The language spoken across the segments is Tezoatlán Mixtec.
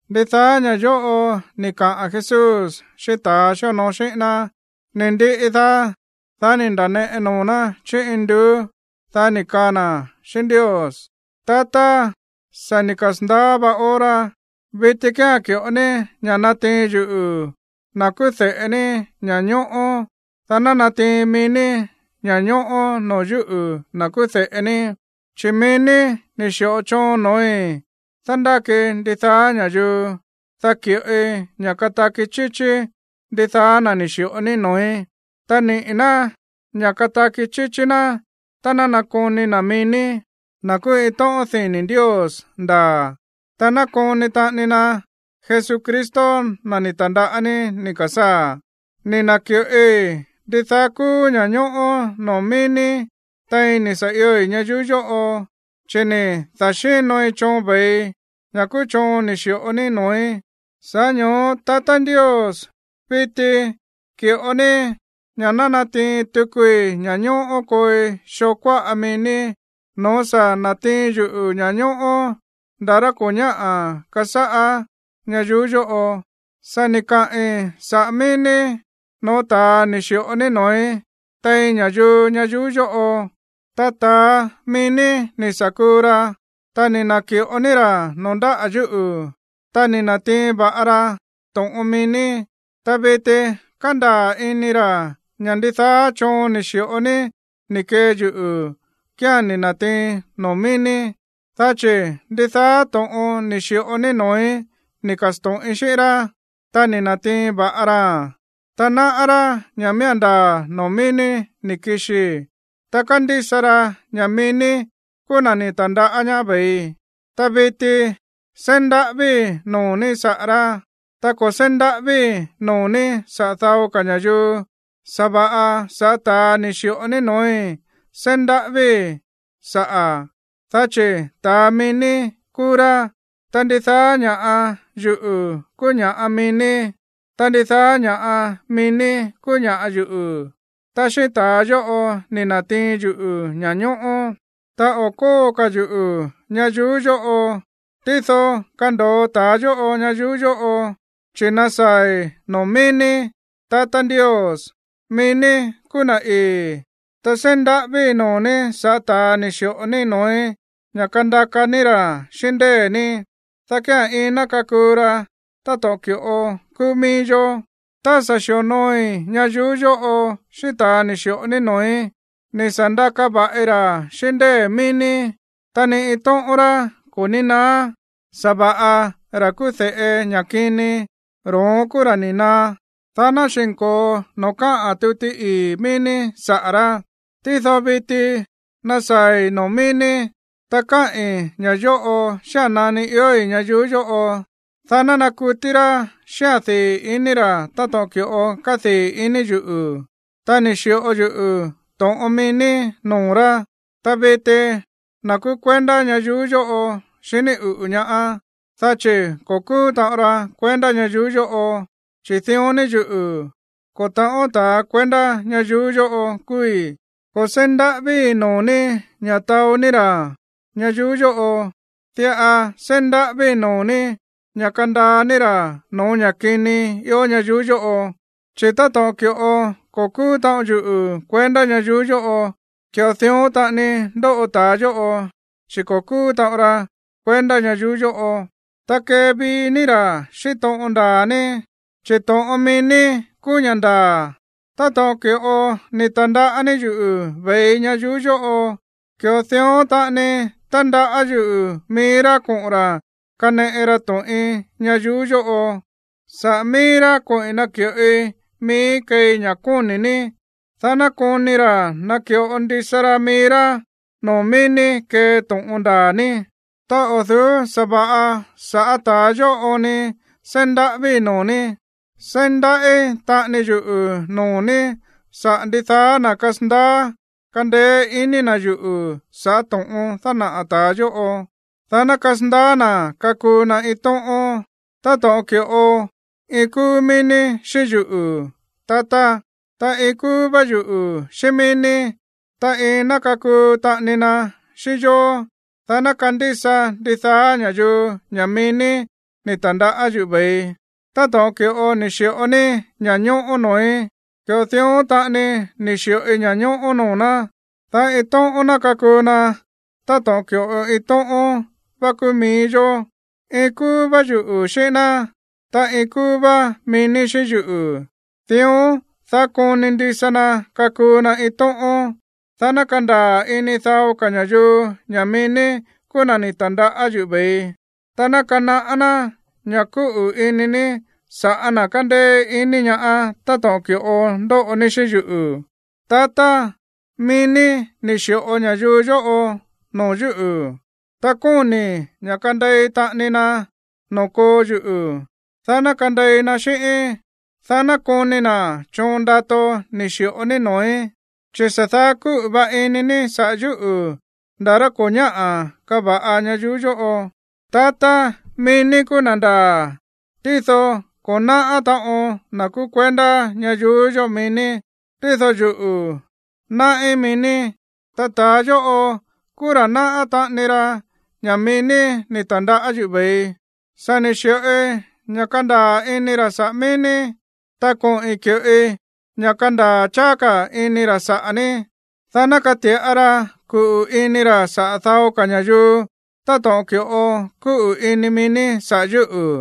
Ndidaá ña̱ yóꞌo ni̱ kaꞌa̱n Jesús xíꞌín ta̱ xíonoo xíꞌín ná. Ni̱ ndiꞌi daá, dá ni̱ nda̱neꞌe noo̱ ná chí induú, dá ni̱ kaa na̱ xíꞌín Ndios: ―Tatá, sa̱ ni̱ kasa̱ndaá vá hora, viti kía̱n ki̱ꞌo ní ña̱ natiin yuꞌu̱, na̱ kúú de̱ꞌe ní, ña̱ñóꞌó, dá ná natiin mií ní ña̱ñóꞌó noo̱ yúꞌu̱, na̱ kúú de̱ꞌe ní. Chi̱ mií ní ni̱ xi̱ꞌo choon no̱ói̱ dándákii ndidaá ña̱yuu, dá ki̱ꞌoi ña̱ kataki chíchí ndidaá na̱ ni̱ xi̱ꞌo ní noo̱í. Ta niꞌi̱ ná ña̱ kataki chíchí ná tá ná nakoni na̱ mií ní, na̱ kúú iin tóꞌón dini̱ Ndios ndaa̱, ta nakoni taꞌani na Jesucristo, na̱ ni̱ ta̱ndaꞌá ní ni̱ ka̱sáa̱. ’Ni̱ na̱ki̱ꞌoi ndidaá kúú ña̱ñóꞌó noo̱ mií ní tein ni̱ sa̱ ioi̱ ñayuú yóꞌo, chi̱ ni̱ da̱xínoi choon ve̱ii, ña̱ kúú choon ni̱ xi̱ꞌo ní noo̱í. Sa̱ꞌá ño̱ó, tatá Ndios, viti ki̱ꞌo ní ña̱ ná natiin tukui ña̱ñóꞌó kooi xoo kuáꞌa mií ní no̱ó sa̱ na̱tiin yuꞌu̱ ña̱ñóꞌó ndaa̱ rá ko̱ ñáꞌa̱ kasáꞌá ñayuú yóꞌo. ’Sa̱ ni̱ kaꞌi̱n saꞌa̱ mií ní no̱ó ta̱a ni̱ xi̱ꞌo ní noo̱í tein ña̱yuu ñayuú yóꞌo. Ta ta̱a mií ní ni̱ sa̱ kuu ra, ta ni̱ na̱ki̱ꞌo ní ra̱ noo̱ ndáꞌa̱ yuꞌu̱, ta ni̱ na̱tiin va̱ꞌa ra to̱ꞌon mií ní. Ta viti kándaa̱ ini ra̱ ña̱ ndidaá choon ni̱ xi̱ꞌo ní ni̱ kee yuꞌu̱ kía̱n ni̱ na̱tiiin noo̱ mií ní, dá chi̱ ndidaá to̱ꞌon ni̱ xi̱ꞌo ní noo̱í ni̱ ka̱sto̱ꞌin xíꞌín rá, ta ni̱ na̱tiin va̱ꞌa raa̱n, ta náꞌá rá ña̱ miía̱n ndaa̱ noo̱ mií ní ni̱ kixii, ta kándísa ra ña̱ mií ní kúú na̱ ni̱ ta̱ndaꞌá ñaá ve̱ii. ’Ta viti seí ndaꞌávíi̱ noo̱ ní saꞌa̱ rá, ta ko̱ seí ndaꞌávíi̱ noo̱ ní saꞌa̱ dao ka̱ ña̱yuu, sa̱va̱ꞌa sa̱ꞌá ta̱a ni̱ xi̱ꞌo ní no̱ói̱ seí ndaꞌávíi̱ saꞌa̱, dá chi̱ ta̱a mií ní kúú rá. Ta ndidaá ña̱ꞌa yuꞌu̱ kúú ña̱ꞌa mií ní, ta ndidaá ña̱ꞌa mií ní kúú ña̱ꞌa yuꞌu̱, ta xíꞌín ta̱a yóꞌo ni̱ na̱tiin yuꞌu̱ ña̱ñóꞌó. ’Ta o̱ kóo ka̱ yuꞌu̱ ñayuú yóꞌo, tído kando̱o ta̱a yóꞌo ñayuú yóꞌo, chi̱ nasaa̱i̱ noo̱ mií ní. Tatá Ndios, mií ní kúú na̱ ii̱, ta seí ndaꞌávíi̱ noo̱ ní sa̱ꞌá ta̱a ni̱ xi̱ꞌo ní noo̱í ña̱ kandaka ní ra̱ xíꞌín ndée̱ ní, dá kía̱n iin ná kakuu ra táto̱ꞌon ki̱ꞌo kúú mií yó. Tá sa̱ xi̱onooi ñayuú yóꞌo xíꞌín ta̱ ni̱ xi̱ꞌo ní noo̱í, ni̱ sa̱ ndaka va̱ꞌi ra̱ xíꞌín ndée̱ mií ní, ta ni iin tóꞌón rá ko̱ ní naá. Sa̱va̱ꞌa ra̱ kúú de̱ꞌe ña̱ kini, ro̱ón kúú ra̱ ni̱ naá, dá ná xi̱nko̱o noo̱ káꞌa̱n tuti ii̱ mií ní saꞌa̱ rá. ’Tído viti nasaa̱i̱ noo̱ mií ní, ta káꞌi̱n ña̱ yóꞌo xía̱n nani iói̱ ñayuú yóꞌo, dá ná nakutí rá xíꞌa̱n dii̱ i̱ní ra̱ táto̱ꞌon ki̱ꞌo kádii̱ ini yuꞌu̱. Ta ni̱ xi̱ꞌo yuꞌu̱ to̱ꞌon mií ní noo̱ rá, ta viti na̱ kúú kuendá ñayuú yóꞌo xiní uꞌu̱ ñaá, dá chi̱ ko̱ kúú taꞌon ra kuendá ñayuú yóꞌo, chi̱ dión ni yuꞌu̱, ko̱ ta̱ꞌón ta̱a kuendá ñayuú yóꞌo kúúí. Ko̱ seí ndaꞌávíi̱ noo̱ ní ña̱ taó ní ra̱ ñayuú yóꞌo, diꞌa seí ndaꞌávíi̱ noo̱ ní ña̱ kandaa ní ra̱ no̱ó ña̱ kini ió ñayuú yóꞌo. Chi̱ táto̱ꞌon ki̱ꞌo ko̱ kúú taꞌon yuꞌu̱ kuendá ñayuú yóꞌo, ki̱ꞌo dión taꞌani ndóꞌo ta̱a yóꞌo, chi̱ ko̱ kúú taꞌon ra kuendá ñayuú yóꞌo. Ta kevií ní ra̱ xíꞌín to̱ꞌon ndaa̱ ní, chi̱ to̱ꞌon mií ní kúú ña̱ ndaa̱. Táto̱ꞌon ki̱ꞌo ni̱ ta̱ndaꞌá ní yuꞌu̱ ve̱ii ñayuú yóꞌo, ki̱ꞌo dión taꞌani tandaꞌá yuꞌu̱ mií rá koꞌo̱n ra̱ kaneꞌe ra to̱ꞌin ñayuú yóꞌo. Sa̱ꞌá mií rá koꞌi̱n naki̱ꞌoi miíí keei ña̱ kóni̱ ní, dá ná koni ra̱ naki̱ꞌo ndisa ra mií rá noo̱ mií ní kee to̱ꞌon ndaa̱ ní. ’Ta o̱ du̱ú sa̱va̱ꞌa sa̱ꞌá ta̱ yóꞌo oon ni seí ndaꞌávíi̱ noo̱ ní, seí ndaꞌí taꞌani yuꞌu̱ noo̱ ní saꞌa̱ ndidaá na̱ kasandaá kandeé ini na̱ yuꞌu̱ sa̱ꞌá to̱ꞌon dánaꞌa̱ ta̱ yóꞌo, dá ná kasandaá na̱ kakuu na iin tóꞌón, táto̱ꞌon ki̱ꞌo iin kúú mií ní xíꞌín yuꞌu̱, tatá, ta iin kúú vá yuꞌu̱ xíꞌín mií ní, ta iin ná kakuu taꞌani na xíꞌín yó, dá ná kandísa ndidaá ña̱yuu ña̱ mií ní ni̱ ta̱ndaꞌá yuꞌu̱ ve̱ii. Táto̱ꞌon ki̱ꞌo ni̱ xi̱ꞌo ní ña̱ñóꞌó noo̱í, ki̱ꞌo dión taꞌani ni̱ xi̱ꞌoi ña̱ñóꞌó noo̱ ná, dá iin tóꞌón ná kakuu na táto̱ꞌon ki̱ꞌo iin tóꞌón vá kúú mií yó. Iin kúú vá yuꞌu̱ xíꞌín ná, ta iin kúú vá mií ní xíꞌín yuꞌu̱, dión, dá koni ndisa na kakuu na iin tóꞌón, dá ná kandaa̱ ini dao ka̱ ña̱yuu ña̱ mií ní kúú na̱ ni̱ ta̱ndaꞌá yuꞌu̱ ve̱ii, ta ná kanaꞌá ná ña̱ kúꞌu̱ ini ní sa̱ꞌá na̱ kándéé iní ñaá táto̱ꞌon ki̱ꞌo ndóꞌo ní xíꞌín yuꞌu̱. ’Tatá, mií ní ni̱ xi̱ꞌo ña̱yuu yóꞌo noo̱ yúꞌu̱, ta kóni̱i̱ ña̱ kandei taꞌani na noo̱ koo yuꞌu̱, dá ná kandei na xíꞌíín, dá ná koni na̱ choon ndato ni̱ xi̱ꞌo ní noo̱í, chi̱ sa̱ daá kúꞌu̱ va ini ní saꞌa̱ yúꞌu̱ nda̱ rá ko̱ ñáꞌa̱ kava̱ꞌa ñayuú yóꞌo. Tatá, mií ní kúú na̱ ndaa̱, tído ko̱ náꞌá taꞌon na̱ kúú kuendá ñayuú yóꞌo mií ní, tído yuꞌu̱, náꞌí mií ní, ta ta̱a yóꞌo kúú ra̱ náꞌá taꞌani ra ña̱ mií ní ni̱ ta̱ndaꞌá yuꞌu̱ ve̱ii. Sa̱ ni̱ xi̱ꞌoi ña̱ kándaa̱ ini ra̱ saꞌa̱ mií ní, ta koꞌi̱n ki̱ꞌoi ña̱ kandaa̱ cháá ka̱ ini ra̱ saꞌa̱ ní, dá ná kati̱ꞌa ra kuꞌu̱ ini ra̱ saꞌa̱ dao ka̱ ña̱yuu táto̱ꞌon ki̱ꞌo kúꞌu̱ ini mií ní saꞌa̱ yúꞌu̱,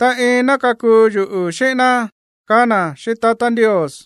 ta iin ná kakuu yuꞌu̱ xíꞌín ná ―kaá na̱ xíꞌín tatá Ndios.